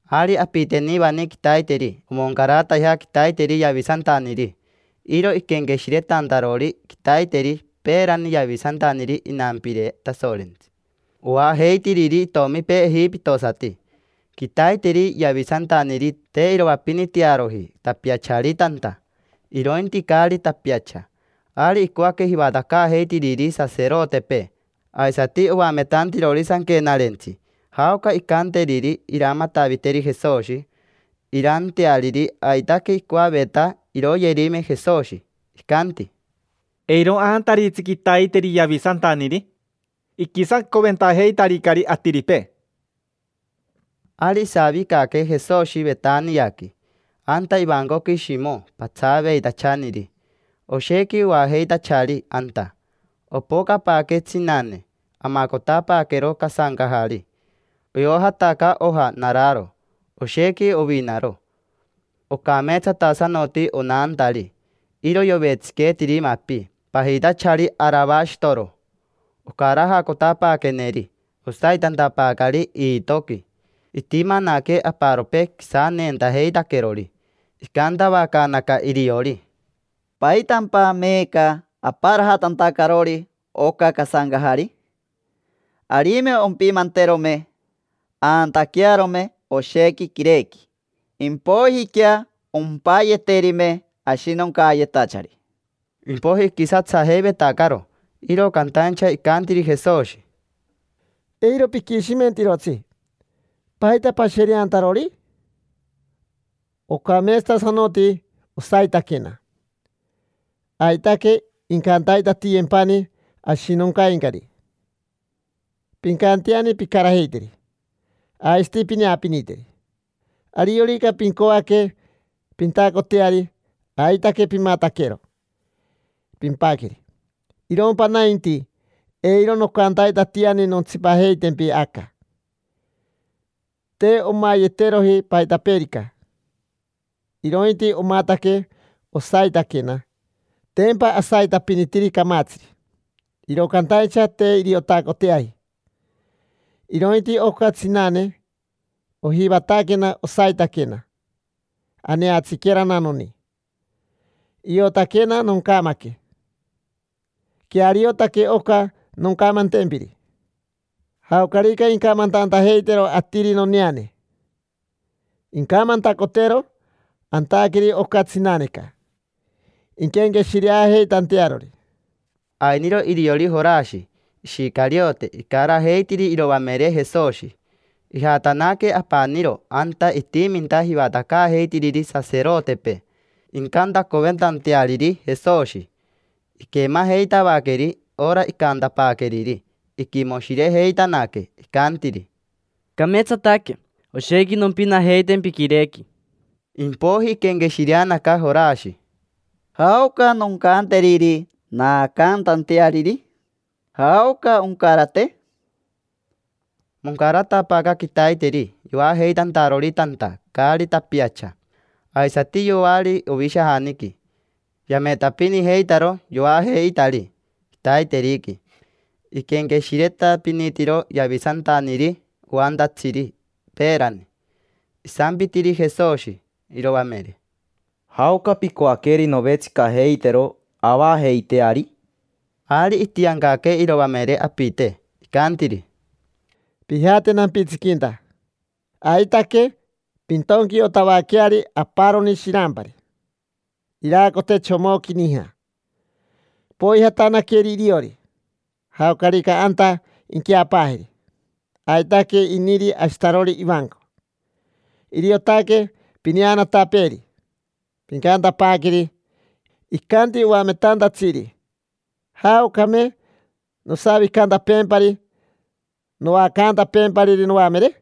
Ari apitenivani quitaiteri omoncaratajea quitaiteri yavisantaniri. Iro iquenqueshiretantarori quitaiteri peerani yavisantaniri inampire Tasorentsi, oajeitiriri itomipee ejipitosati. Quitaiteri yavisantaniri te iroapinitearoji tapiachari tanta, irointi caari tapiacha. Ari icoaque jivatacaajeitiriri saserotepee aisati oametantirori sanquenarentsi jaoca incanteriri iramataviteri Jesoshi, iraanteariri. Aitaque icoaveta iroyerime Jesoshi. Icanti: —Eiro aantaritsi quitaiteri yavisantaniri: iquisacoventajeitaricari atiripee. Ari isavicaque Jesoshi Vetaniaqui, anta ivancoqui Shimo patsaaveitachaniri. Oshequi oajeitachari anta. Opocapaaque tsinane, amacotapaaquero casancajari. Iojataca oja nararo, oshequi ovinaro. Ocameetsatasanoti onantari, iro yovetsiqueetiri mapi pajitachari aravashitoro. Ocarajacotapaaqueneri, osaitantapaacari iitoqui. Itimanaque aparopee quisaneentajeitaquerori. Icantavacaanaca iriori: —¿Paitampa meeca aparajatantacarori oca casancajari? Arime ompimanterome, aantaquearome oshequi quirequi, impoijiquea ompayeterime ashinoncayetachari. Impoiji iquisatsajeivetacaro, iro cantaincha icantiri Jesoshi: —Eiro piquishimentirotsi. ¿Paita pashereantarori? Ocameetsatasanoti osaitaquena. Aitaque incantaitatiyempani ashinoncaincari: pincanteani pincarajeiteri, aisati pineapiniteri. Ariorica pincoaque pintacoteari, aitaque pimataquero, pimpaqueri. Irompa nainti, eiro nocantaitatiani nontsipajeitempi aca. Te omayeteroji paitapeerica, irointi omataque osaitaquena. Tempa asaitapinitiri camatsiri, iro cantaincha te iriotacoteaji. Irointi oca tsinane ojivataquena osaitaquena, aneatsiquerana noni. Iotaquena noncamaque. Queariotaque oca noncamantempiri: jaocarica incamantantajeitero atiri noneane, incamantacotero antaqueri oca tsinaneca, inquenqueshireajeitantearori. Ainiro iriori Jorashi Ishicariote icarajeitiri iroamere Jesoshi. Ijatanaque apaniro anta itiminta jivatacaajeitiriri saserotepee, incantacoventanteariri Jesoshi. Iquemajeitavaqueri ora icantapaaqueriri, iquimoshirejeitanaque, icantiri: —Cameetsataque: oshequi nompinajeitempi quirequi. Impoiji iquenqueshireti Jorashi: —¿Jaoca noncanteriri naacantanteariri? ¿Jaoca oncarate? Moncaratapaaca quitaiteri yoajeitantarori tanta, caari tapiacha. Aisati yoari ovishajaniqui: yametapinijeitaro yoajeitari quitaiteriqui iquenqueshiretapinitiro yavisantaniri oantatsiri peerani. Isampitiri Jesoshi iroamere: —¿Jaoca picoaqueri novetsicajeitero avajeiteari? Ari itiancaque iroamere apite, icantiri: —Pijate nampitsiquinta. Aitaque pintonquiotavaqueari aparoni shirampari, iraacote chomoqui nija. Poijatanaqueri iriori. Jaocarica anta inqueapaajeri, aitaque iniri ashitarori ivanco; iriotaque pineanatapeeri. Pincantapaaqueri: “Icanti oametantatsiri: ‘¿Jaocame nosavicantapeempari, noacantapeempariri noamere?’”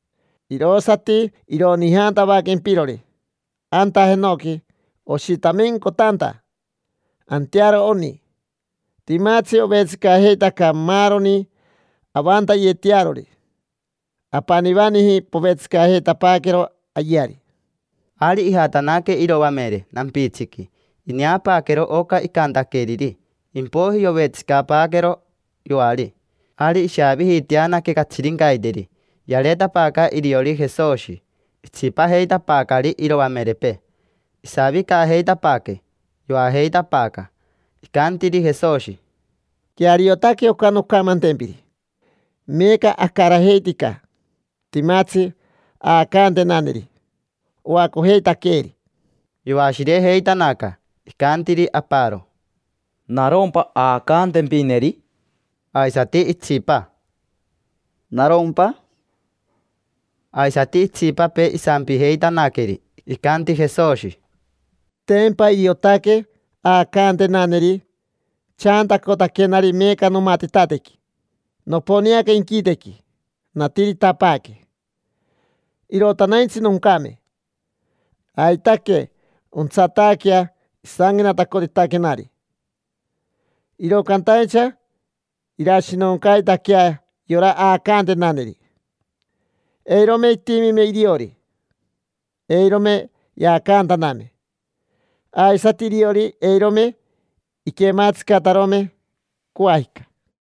Irosati ironijantavaquempirori anta jenoqui oshitamencotanta: antearo oni. Timatsi ovetsicajeitaca maaroni avantayetearori: apanivaniji povetsicajeitapaaquero ayeari. Ari ijatanaque iroamere nampitsiqui, ineapaaquero oca icantaqueriri, impoiji yovetsicapaaquero yoari. Ari ishaavijiiteanaque catsirincaiteri. Yareetapaaca iriori Jesoshi, itsipajeitapaacari iroamerepee. Isavicajeitapaaque, yoajeitapaaca, icantiri Jesoshi: —Queariotaque oca noncamantempiri. Meeca acarajeitica, timatsi aacantenaneri, oacojeitaqueeri. Yoashirejeitanaca, icantiri aparo: —¿Narompa aacantempineri? Aisati itsipa: —¿Narompa? Aisati itsipapee isampijeitanaqueri. Icanti Jesoshi: —Tempa iriotaque aacantenaneri chaantacotaquenari meeca nomatitatequi. Noponeaca inquitequi, natiritapaaque. Irotanaintsi noncame: aitaque ontsataaquea isanquenatacotitaquenari. Iro cantaincha irashinoncaitaquea yora aacantenaneri. Eirome itimime iriori, eirome yaacantaname, aisati iriori eirome iquematsicatarome, coajica.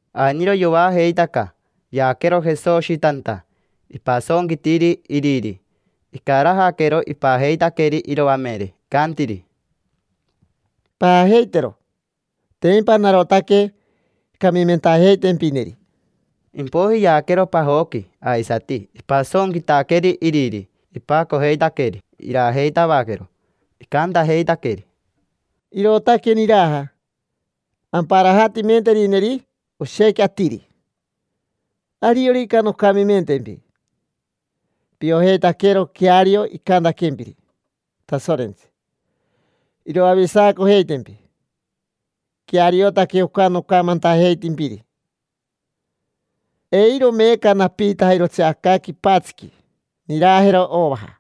Ainiro yoajeitaca, yaaquero Jesoshi tanta. Ipasonquitiri iriri, icarajaquero, ipajeitaqueri iroamere. Icantiri: —Paajeitero, tempa narotaque camimentajeitempineri. Impoiji yaaquero pajoqui aisati. Ipasonquitaqueri iriri, ipacojeitaqueri, irajeitavaquero. Icantajeitaqueri: —Irootaque niraja amparajatimenterineri oshequi atiri. Ariorica noncamimentempi, piojeitaquero queario icantaquempiri Tasorentsi, iroavisacojeitempi. Queariotaque oca nocamantajeitimpiri. Eiro meeca napiitajirotsi aca quipatsiqui nirajero ovaja.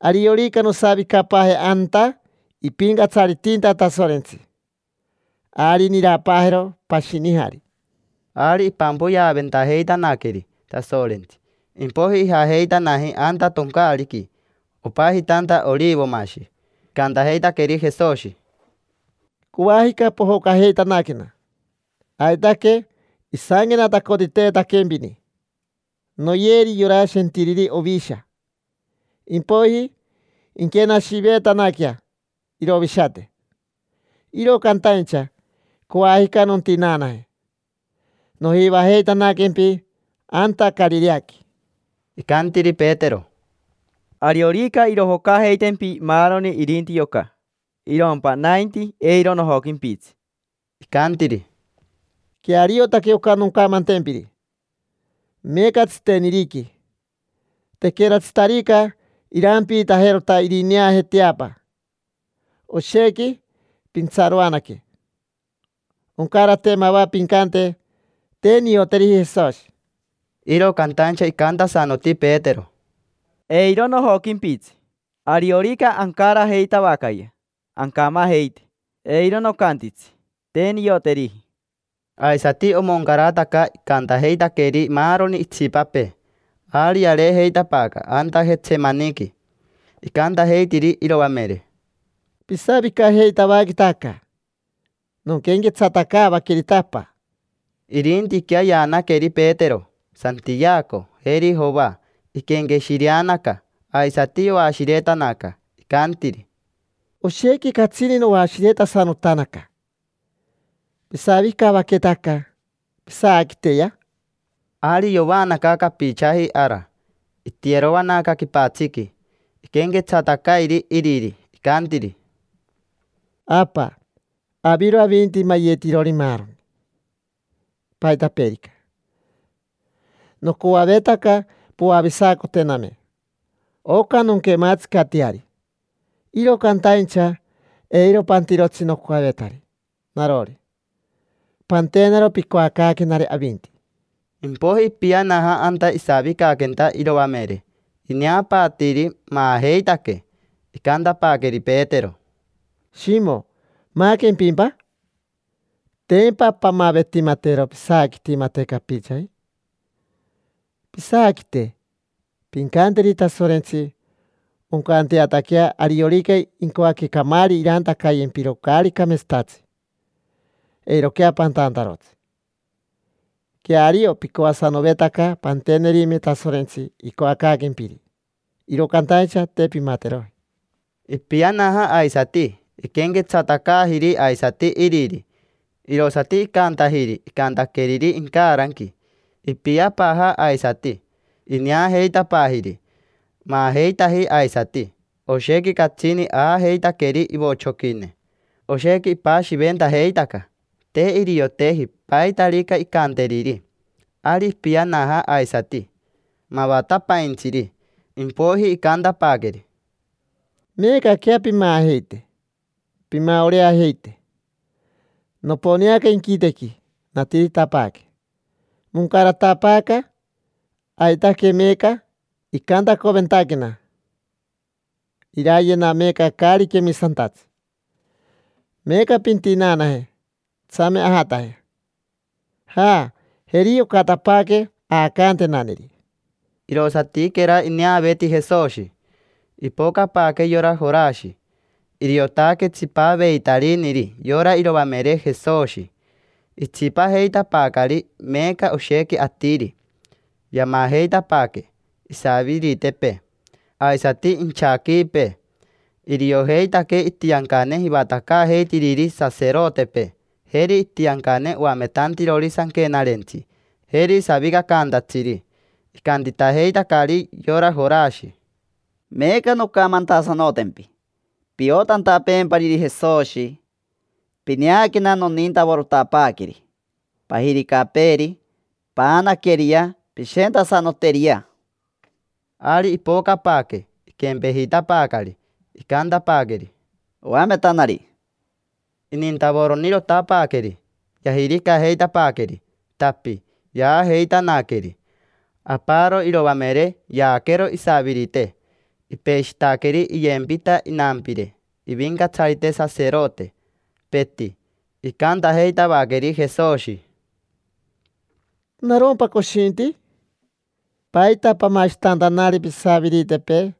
Ariorica nosavicapaaje anta ipincatsaritinta Tasorentsi, ari nirapaajero pashinijari. Ari ipampoyeaventajeitanaqueri Tasorentsi, impoiji ijajeitanaji anta toncaariqui, opajitanta Orivomashi. Icantajeitaqueri Jesoshi: —Coajica pojocajeitanaquena. Aitaque isanquenatacotiteetaquempini: “Noyeri yora shentiriri ovisha, impoiji inquenashiveetanaquea irovishate”. Iro cantaincha, coajica nontinaanaje, nojivajeitanaquempi anta Carireaqui. Icantiri Petero: —Ariorica irojocajeitempi maaroni irinti yoca, irompa nainti, eiro nojoquimpitsi. Icantiri: —Queariotaque oca noncamantempiri: meeca tsiteniriqui, tequeratsitarica irampiitajerota irineaje teapa, oshequi pintsaroanaque. Oncarate mava pincante: “Te nioteriji Jesoshi”. Iro cantaincha icantasanoti Petero: —Eiro nojoquimpitsi. Ariorica ancarajeitavacayea ancamajeite, eiro nocantitsi: “Te nioteriji”. Aisati omoncarataca icantajeitaqueri maaroni itsipapee. Ari yareejeitapaaca anta Jetsemaniqui. Icantajeitiri iroamere: —Pisavicajeitavaqueta aca, nonquenquetsatacaavaquerita Apa. Irintiquea yaanaqueri Petero, Santiaco, jeri Joa. Iquenqueshireanaca, aisati yoashiretanaca. Icantiri: —Oshequi catsini noashiretasanotanaca. Pisavicavaqueta aca, pisaaquiteyea. Ari yovaanaca capichaji ara. Itiyeroanaca quipatsiqui, iquenquetsatacairi iriri. Icantiri: —Apa, aviro avinti mayetirori maaroni, paitapeerica. Nocoavetaca poavisacotename oca nonquematsicateari, iro cantaincha eiro pantirotsi nocoavetari narori, pantenaro picoacaaquenari avinti. Impoiji ipianaja anta isavicaquenta iroamere. Ineapaatiiri, maajeitaque. Icantapaaqueri Petero: —Shimo, ¿maaquempimpa? Tempa pamavetimatero pisaaquitimate capichaji. Pisaaquite. Pincanteri Tasorentsi oncanteataquea ariorica incoaque camaari irantacayetempiro caari cameetsatatsi, eiroquea pantantarotsi. Queario picoasanovetaca pantenerime Tasorentsi icoacaaquempiri, iro cantaincha te pimateroji. Ipianaja aisati, iquenquetsatacaajiri aisati iriri. Irosati icantajiri icantaqueriri incaranqui. Ipiapaaja aisati, ineajeitapaajiri, maajeitaji aisati. Oshequi catsini aajeitaqueri ivochoquine. Oshequi ipashiventajeitaca, te irioteji paitarica incanteriri. Ari ipianaja aisati mavatapaintsiri. Impoiji icantapaaqueri: —Meecaquea pimaajeite, pimaoreajeite. Noponeaca inquitequi, natiritapaaque. Moncaratapaaca, aitaque meeca icantacoventaquena: irayena meeca caari quemisantatsi. Meeca pintinaanaje, tsame ajataje. Ja, jeri yocatapaaque aacantenaneri. Irosatiquera ineaveeti Jesoshi, ipocapaaque yora Jorashi, iriotaque tsipaveitariniri yora iroamere Jesoshi. Itsipajeitapaacari meeca oshequi atiri. Yamajeitapaaque isaviritepee, aisati inchaquiipee. Iriojeitaque itiancane jivatacaajeitiriri saserotepee, jeri itiancane oametantirori sanquenarentsi, jeri savicacantatsiri. Icantitajeitacari yora Jorashi: —Meeca noncamantasanotempi piotantapeempariri Jesoshi: pineaquena nonintavorotapaaqueri, pajiricapeeri. Paanaqueriyea, pishentasanoteriyea. Ari ipocapaaque, iquempejitapaacari. Icantapaaqueri: —Oametanari. Inintavoronirotapaaqueri. Yajiricajeitapaaqueri, tapi, yaajeitanaqueri. Aparo iroamere yaaquero isavirite. Ipeshitaqueri iyempita inampire ivincatsarite saserote, peti. Icantajeitavaqueri Jesoshi: —¿Narompa coshinti? ¿Paita pamashitantanari pisaviritepee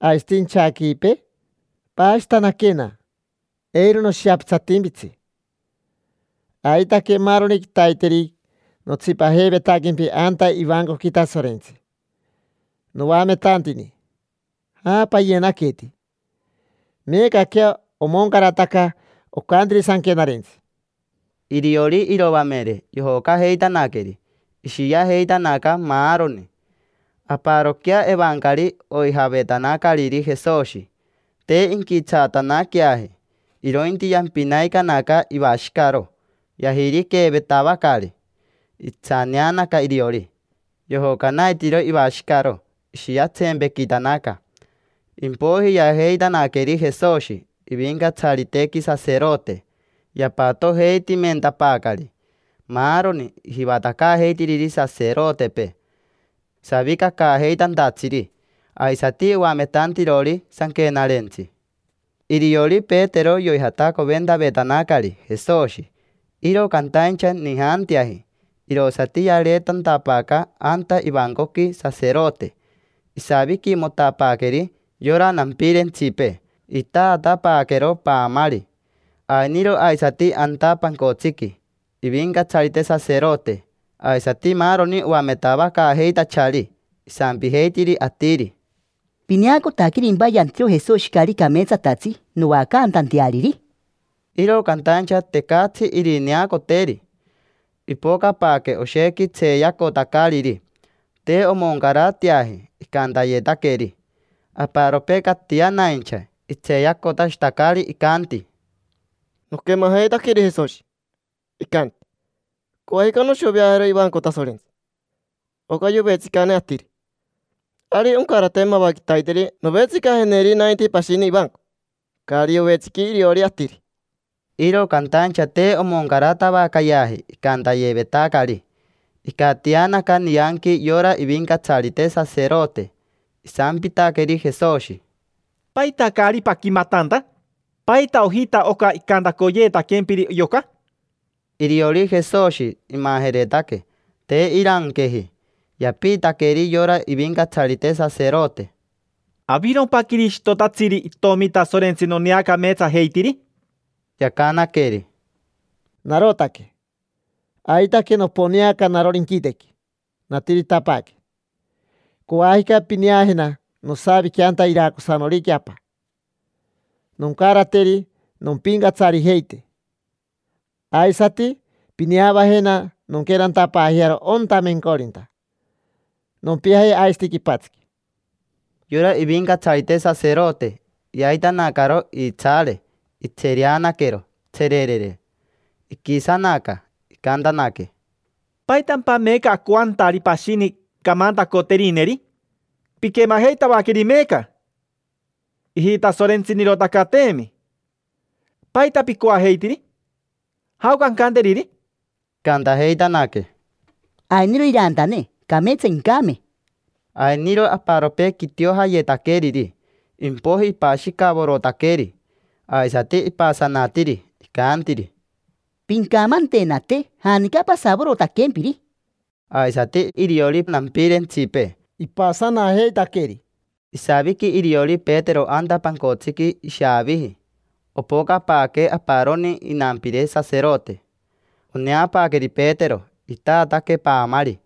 aisati inchaquiipee? Paashitanaquena, eiro noshiapitsatimpitsi. Aitaque maaroni quitaiteri notsipajeivetaquempi anta ivancoqui Tasorentsi, noametantini. Ja, payenaniqueti. Meecaquea omoncarataca ocantiri sanquenarentsi. Iriori iroamere, yojocajeitanaqueri, ishiajeitanaca maaroni. Aparoquea evancari oijavetanacariri Jesoshi. Te inquitsaatanaqueaji, irointi yampinaicanaca ivashicaro. Yajiriqueevetavacari, itsaneanaca iriori, yojocanaitiiro ivashicaro, ishiatsempequitanaca. Impoiji yaajeitanaqueri Jesoshi ivincatsaritequi saserote. Yapatojeitimentapaacari maaroni jivatacaajeitiriri saserotepee, savicacaajeitantatsiri, aisati oametantirori sanquenarentsi. Iriori Petero yoijatacoventavetanacari Jesoshi, iro cantaincha nijanteaji, irosati yareetantapaaca anta ivancoqui saserote. Isaviquimotapaaqueri yora nampirentsipee, itatapaaquero paamari. Ainiro aisati anta pancotsiqui ivincatsarite saserote aisati maaroni oametavacaajeitachari. Isampijeitiri atiri: —¿Pineacotaquerimpa yantiro Jesoshi caari cameetsatatsi noacantanteariri? Iro cantaincha, tecatsi irineacoteri. Ipocapaaque oshequi tseeyacotacariri, te omoncarateaji icantayetaqueri. Aparopee catianaincha, itseeyacotashitacari, icanti: —Noquemajeitaqueri Jesoshi, icanti: “Coajica noshoveajero ivanco Tasorentsi, oca yovetsicane atiri. Ari oncarate mava quitaiteri novetsicajeneri nainti pashini ivanco, caari yovetsiqui iriori atiri”. Iro cantaincha te omocaratavacayeaji icantayevetacari. Icatianaca nianqui yora ivincatsarite saserote. Isampitaqueri Jesoshi: —¿Paita caari paquimatanta? ¿Paita ojita oca icantacoyetaquempiri yoca? Iriori Jesoshi imajeretaque, te iranqueji. Yapiitaqueri yora ivincatsarite saserote: —¿Avirompa Quirishitotatsiri, itomi Tasorentsi noneacameetsajeitiri? Yacanaqueri: —Narotaque. Aitaque noponeaca narori inquitequi, natiritapaaque. Coajica pineajena nosavique anta iracosanoriqui Apa, noncarateri nompincatsarijeite. Aisati pineavajena nonquenantapaajearo onta mencorinta, nompiaje aisati quipatsiqui. Yora ivincatsarite saserote yaitanacaro iitsaare, itsereanaquero, tsererere; iquisanaca. Icantanaque: —¿Paitampa meeca acoantari pashini camantacoterineri? Piquemajeitavaqueri meeca: ijitasorentsinirotacateemi. ¿Paita picoajeitiri? ¿Jaoca ancanteriri? Icantajeitanaque: —Ainiro irantane, cameetsa incame. Ainiro aparopee quitiojayetaqueriri. Impoiji ipashicavorotaqueri, aisati ipasanatiri. Icantiri: —Pincamantenate janica pasavorotaquempiri. Aisati iriori nampirentsipee, ipasanajeitaqueri. Isaviqui iriori Petero anta pancotsiqui ishaaviji. Opocapaaque aparoni inampire saserote. Oneapaaqueri Petero, itaataque paamari.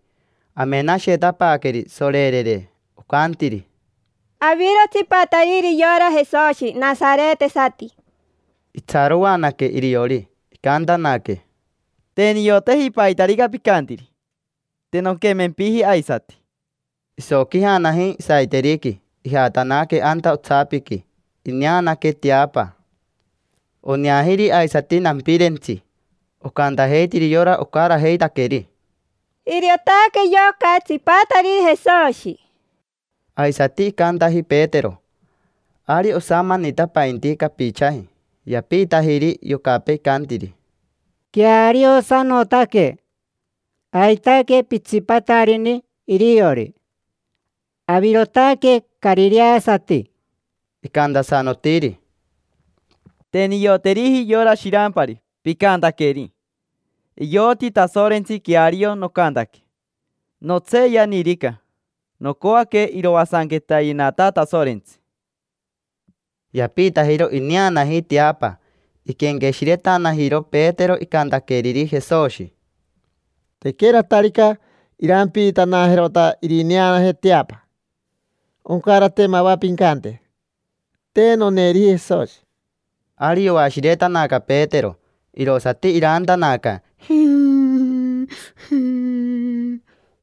Amenashetapaaqueri, sorerere, ocantiri: —Aviro tsipatariri yora Jesoshi nasaretesati. Itsaroanaque iriori, icantanaque: —Jm, te nioteji paitarica picantiri. Te nonquemempiji aisati. Isoquijanaji saiteriqui, ijatanaque anta otsapiqui. Ineanaque teapa. Oneajiri aisati nampirentsi. Ocantajeitiri yora ocarajeitaqueri: —Iriotaque yoca tsipatariri Jesoshi. Aisati icantaji Petero. Ari osamanitapainti capichaji. Yapiitajiri yocapee, icantiri: —Queariosanotaque. Aitaque pitsipatarini iriori, avirotaque carireasati. Icantasanotiri: —Te nioteriji yora shirampari picantaqueri. Ioti Tasorentsi queario nocantaque: notseeyanirica, nocoaque iroasanquetayenata Tasorentsi. Yapiitajiro ineanaji teapa. Iquenqueshiretanajiro Petero icantaqueriri Jesoshi: “Tequeratarica irampiitanajerota irineaje teapa, oncarate mava pincante: ‘Te noneeriji Jesoshi’”. Ari yoashiretanaca Petero, irosati iraantanaca, jii, jii.